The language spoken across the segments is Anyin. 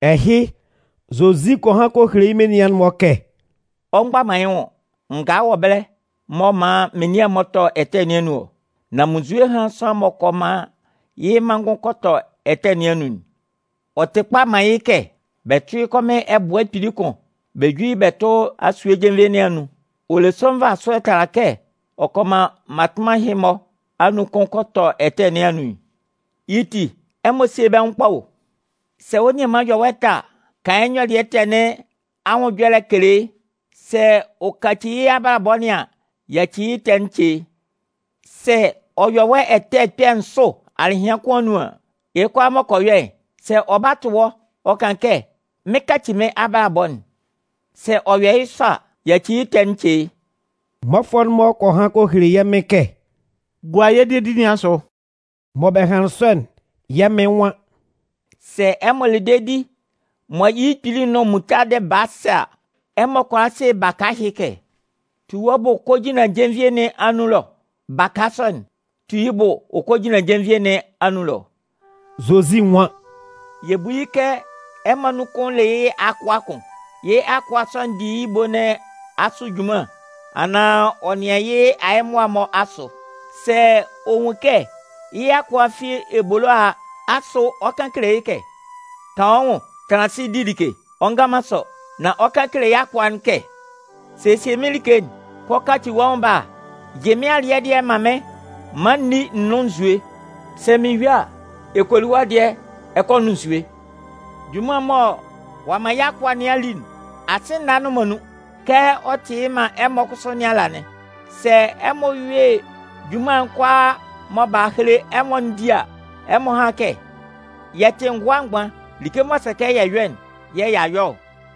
Ɛhɩ, Zozi kɔ han kɔ hele yɩ́ menian'n-mɔ kɛ: “Ɔ mgba man yɩ́ nwʋn, ngaa wɔ ɛbɛlɛ mɔ ɔ 'man menian'n-mɔ tɔ ɛtɛ nɩn anun ɔ. Nan munnzue hán sʋanlan m'ɔ kɔ man yɩ́ manngʋn kɔ tɔ ɛtɛ nɩn anun'n. Ɔ tɩ kpa man yɩ́ kɛ bɛ tʋ́ yɩ́ kɔmɩn ɛbʋɛ kpili kʋn bɛ jú yɩ́ bɛ tʋ́ asue jenvie nɩn anun. Ɔ le sʋ nvasʋɛ tala kɛ ɔ kɔ man mmatʋnman ɛhɩ-mɔ anun kʋn kɔ tɔ ɛtɛ nɩn anun'n. Yɩ́ ti, ɛmɔ síe bɛ́ nwʋn ye kpa o! “Sɛ wɔ́ nianman yɔ wɔ́ ɛtɛ a, kan yɩ́ nyɔlɩɛ ɛtɛ nɩn anwʋn ɛjɔlɛ kele yɩ́. Sɛ ɔ kaci yɩ́ abalabɔ nɩn an, yaci yɩ́ ɛtɛ'n ce yɩ́. Sɛ ɔ yɔ wɔ́ ɛtɛ kpɛ̂ nsʋ alɩhɩan kʋn anun an, yɩ́ kʋalaa m'ɔ kɔ yɔ'n, sɛ ɔ ba tʋ wɔ́ ɔ kan kɛ: ‘Mɩn 'kaci mɩ́n abalabɔ'n,’ sɛ ɔ yɔ yɩ́ sɔ a, yaci yɩ́ ɛtɛ'n ce yɩ́.” Mmɔfʋɛ'n-mɔ kɔ han kɔ hele yɛ́ Mɩn kɛ: “Gua yɛ́ dedi nɩn asʋ.” Mɔ bɛ hanlɩn sɔ'n, yɛ́ Mɩn nwan: “Sɛ ɛmɔ le dedi mɔ yɩ́ kpili'n nʋn muntadɩ baa sɛ a, ɛmɔ kʋala se baka ɛhɩ kɛ: ‘Tu wɔ́ bʋ kɔ jinlan jenvie nɩn anun ɛlɔ.’ Baka sɔ'n 'tu yɩ́ bʋ ɔ kɔ jinlan jenvie nɩn anun ɛlɔ.” Zozi nwan: “Yɛ bú yɩ́ kɛ ɛmɔ anun kʋn le yɩ́ akʋa kʋn. Yɩ́ akʋa sɔ'n di yɩ́ ebo nɩn asʋ junman anaan ɔ nɩan yɩ́ ayɛmʋa'n-mɔ asʋ. Sɛ ɔ nwun kɛ yɩ́ akʋa'n fi ebolo a a, asʋ ɔ 'kan kele yɩ́ kɛ: ‘Kan wɔ́ nwʋn, tanlan asɩ di like’? Ɔ ngan man sɔ. Nan ɔ 'kan kele yɩ́ akʋa'n kɛ: ‘Sesie mɩ́n like'n, kɔ kaci wɔ́ nwʋn bala yɩ mɩ́n alɩɛ dɩɛ'n man mɩ́n maan n ní n nʋ́n nzue. Sɛ mɩn yue a, ɛ kɔ li wɔ́ dɩɛ ɛ kɔ nʋn nzue.’ Junman'n mɔ ɔ'a man yɩ́ akʋa nɩn a li'n, asɩ nâ nnʋn man nun. Kɛ ɔ tɩ yɩ́ man ɛmɔ kʋsʋ nɩn ala'n. Sɛ ɛmɔ yue junman'n kʋalaa mɔ b'a hele ɛmɔ'n di a, ɛmɔ hán kɛ: ‘Yɛ tɩ ngʋa mgban, like m'ɔ sɛ kɛ yɛ yɔ'n yɛ̂ y'a yɔ ɔ.’”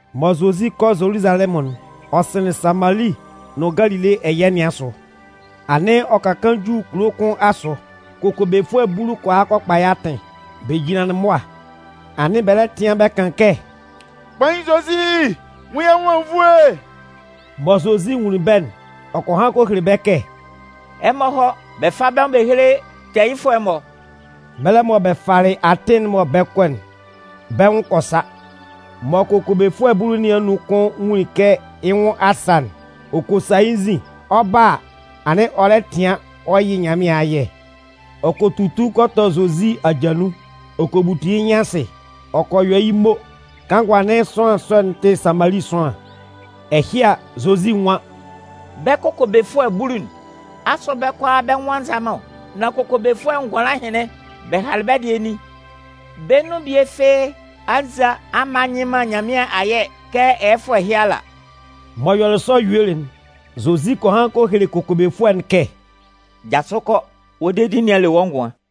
Mɔ Zozi 'kɔ Zoluzalɛmʋn'n, ɔ sɩnlɩn Samali nʋn Galile ɛyɛ nɩn asʋ. Anɩn ɔ ka kaan ju kulo kʋn asʋ, kokobefʋɛ bulu kɔ hɔ kɔ kpa yɩ́ atɩn. Bɛ jinlanlɩn mʋa, anɩn bɛ lɛ tɩan bɛ kan kɛ: “Kpain Zozi, nwun yɛ́ nwʋn anwunnvoe!” Mɔ Zozi nwunlin bɛ́'n, ɔ kɔ han kɔ hele bɛ́ kɛ: “Ɛmɔ hɔ́ bɛ fá bɛ́ nwʋn bɛ héle tɛɛyɩfʋɛ'n-mɔ.” Mɛlɛ mɔ bɛ falɩ atɩn'n mɔ bɛ 'kɔ'n, bɛ́ nwʋn kɔ sa. Mɔ kokobefʋɛ bulu nɩn anun kʋn nwunlin kɛ yɩ́ nwʋn a sa'n, ɔ kɔ sa yɩ́ nzin. Ɔ 'ba a, anɩn ɔ lɛ tɩan ɔ yɩ Nyanmɩan ayɛ. Ɔ kɔ tutu kɔ tɔ Zozi aja nun, ɔ kɔ butu yɩ́ nyɩn asɩ, ɔ kɔ yɔ yɩ́ mo. Kanngʋ anɩn sʋanlan sɔ'n tɩ Samali sʋanlan. Ɛhɩ a, Zozi nwan: “Bɛ́ kokobefʋɛ bulu'n, asʋ bɛ́ kʋalaa bɛ́ nwʋn a nza man ɔ? Nan kokobefʋɛ ngʋanlan ɛhɩnlɩn, bɛ halɩ bɛ́ dɩɛ nin? Bɛ́ nun bie fɩ́ɩ́ a nza a mma nyɩ man Nyanmɩan ayɛ kɛ ɛyɛfʋɛ ɛhɩ ala?” M'ɔ yɔlɩ sɔ yuelɩ'n, Zozi kɔ han kɔ hele kokobefʋɛ'n kɛ: “Jasʋ kɔ, wɔ́ dedi nɩn a le wɔ́ ngʋan.”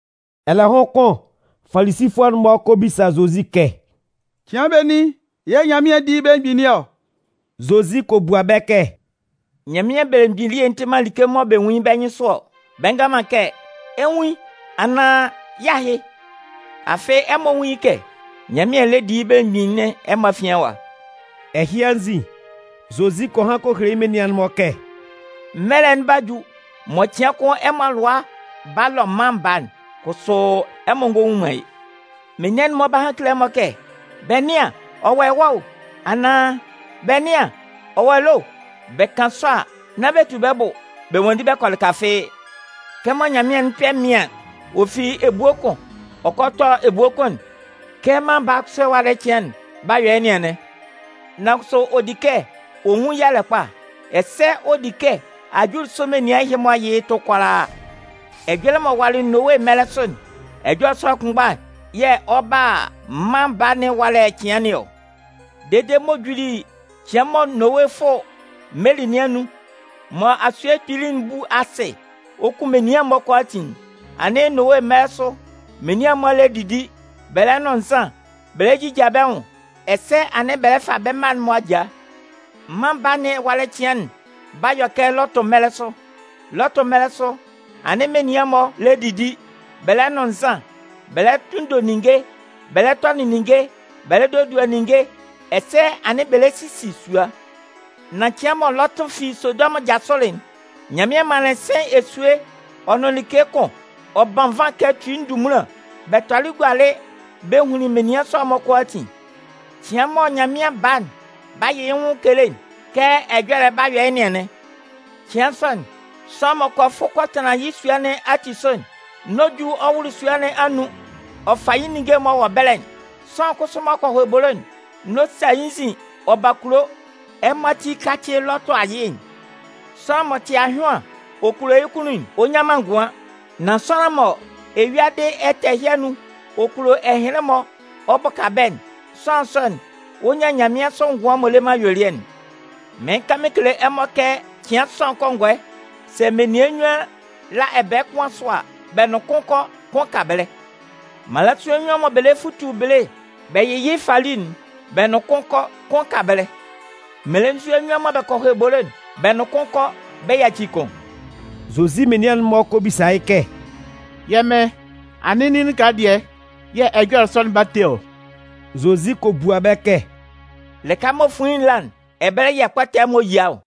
Ɛlɛhʋn kʋn Falisifʋɛ'n-mɔ kɛ bisa Zozi kɛ: “Cɩan benin yɛ̂ Nyanmɩan 'di yɩ́ belemgbin nɩn ɔ?” Zozi kɔ bua bɛ́ kɛ: “Nyanmɩan belemgbin elie'n tɩ man like mɔ bɛ nwun yɩ́ bɛ́ nyɩnsʋ ɔ. Bɛ ngan man kɛ: ‘Ɛ 'nwun yɩ́’ anaan ‘Yɩ́ ahɩ’. Afɩ ɛmɔ nwún yɩ́ kɛ Nyanmɩan lɛ di yɩ́ belemgbin nɩn ɛmɔ afian ɛwa.” Ɛhɩ anzin, Zozi kɔ han kɔ hele yɩ́ menian'n-mɔ kɛ: “Mɛlɛ'n 'ba ju mɔ cɩan kʋn ɛmɔ alʋa 'ba lɔ Mân Baa'n, kʋsʋ ɛmɔ ngɔ nwun man yɩ́. Menian'n-mɔ 'ba han kele ɛmɔ kɛ: ‘Bɛ nɩ́an, ɔ wɔ ɛwa o!’ anaan ‘Bɛ nɩ́an, ɔ wɔ ɛlɔ o!’ Bɛ kan sɔ a, nán bɛ tu bɛ́ bʋ bɛ nwanndi bɛ kɔ lɩka fɩ́ɩ́. Kɛmɔ nyanmɩan'n kpɛ mɩaɩn, ɔ fite ebue kʋn ɔ ta kɔ ebue kʋn'n, kɛ Mân Baa'n kʋsʋ ɛwalɛ cɩan'n 'ba yɔ yɩ́ nɩn anɩn. Nan kʋsʋ ɔ di kɛ ɔ nwun yalɛ kpa, ɛsɛ ɔ di kɛ ajulisʋ menian'n-mɔ yɩ yɩ́ tʋ kʋalaaka. “Ɛjɔlɛ m'ɔ walɩ Nowe mɛlɛ sʋ'n, ɛjɔlɛ sɔ'n kʋnmgba yɛ̂ ɔ 'ba a Mân Baa nɩn ɛwalɛ cɩan nɩn ɔ. Dede m'ɔ juli cɩan mɔ Nowe 'fʋ meli nɩn anun, mɔ asuyie kpili'n 'bu asɩ ɔ kun menian'n-mɔ kʋalaatin'n, anɩn Nowe mɛlɛ sʋ menian'n-mɔ lɛ didi, bɛ lɛ nʋn nzan, bɛ lɛ jija bɛ́ nwʋn, ɛsɛ anɩn bɛ lɛ fa bɛ́ mma'n-mɔ ajaa. “Mân Baa nɩn ɛwalɛ cɩan'n 'ba yɔ kɛ Lɔtʋ mɛlɛ sʋ. Lɔtʋ mɛlɛ sʋ, anɩn menian'n-mɔ lɛ didi, bɛ lɛ nʋn nzan, bɛ lɛ tunndo ninnge, bɛ lɛ tɔnɩn ninnge, bɛ lɛ dodua ninnge ɛsɛ anɩn bɛ lɛ sisi sua. Nan cɩan mɔ Lɔtʋ fi Sodɔmʋn jasʋlɩ'n, Nyanmɩan manlɩn sɩ̂n esue ɔ nʋn like kʋn, ɔ ban nvan kɛ tui ndunmunlan, bɛ tɔlɩ gualɩ bɛ hunlin menian sɔ'n-mɔ kʋalaatin. “Cɩan mɔ Mân Baa'n 'ba yɩ yɩ́ nwʋn kele'n, kɛ ɛjɔlɛ'n 'ba yɔ yɩ́ nɩn anɩn. Cɩan sɔ'n, sʋanlan m'ɔ kɔ fʋ kɔ tanlan yɩ́ sua nɩn ati sʋ'n, n'ɔ ju ɔ wʋlʋ sua nɩn anun ɔ fa yɩ́ ninnge'n m'ɔ wɔ ɛbɛlɛ'n. Sʋanlan kʋsʋ m'ɔ kɔ hɔ ebolo'n, n'ɔ sa yɩ́ nzin ɔ ba kulo. Ɛmɔ ati kácɩ Lɔtʋ ayɩ'n! Sʋanlan m'ɔ tɩ ahyʋan ɔ kulo yɩ́ kunnun'n, ɔ nnyan man ngʋan. Nan sʋanlan mɔ eyuadɩ ɛtɛ ɛhɩ anun ɔ kulo ɛhɩnlɩn-mɔ ɔ bʋka bɛ́'n, sʋanlan sɔ'n, ɔ 'nyan nyanmɩansʋ ngʋan m'ɔ le man ayuelɩɛ'n. Mɩɩn kan mɩn kele ɛmɔ kɛ cɩan sɔ'n kɔngɔɛ, sɛ menian nnyuan la ɛbɛɛ kʋn asʋ a, bɛ nʋn kʋn kɔ, kʋn ka ɛbɛlɛ. Mmalasua nnyuan mɔ bɛ lɛ futu bele bɛ yɩ yɩ́ fali'n, bɛ nʋn kʋn kɔ, kʋn ka ɛbɛlɛ.” [ Mmelenzua nnyuan mɔ bɛ kɔ hɔ ebolo'n, bɛ nʋn kʋn kɔ, bɛ yaci kʋn.] Zozi menian'n-mɔ kɔ bisa yɩ́ kɛ: “Yɛ́ Mɩn, anɩn nin lɩka dɩɛ yɛ̂ ɛjɔlɛ sɔ'n 'ba te ɔ?” Zozi kɔ bua bɛ́ kɛ: “Lɩka mɔ fuin'n la'n, ɛbɛlɛ yɛ̂ ɛkpɔtɛ'n-mɔ yia ɔ.”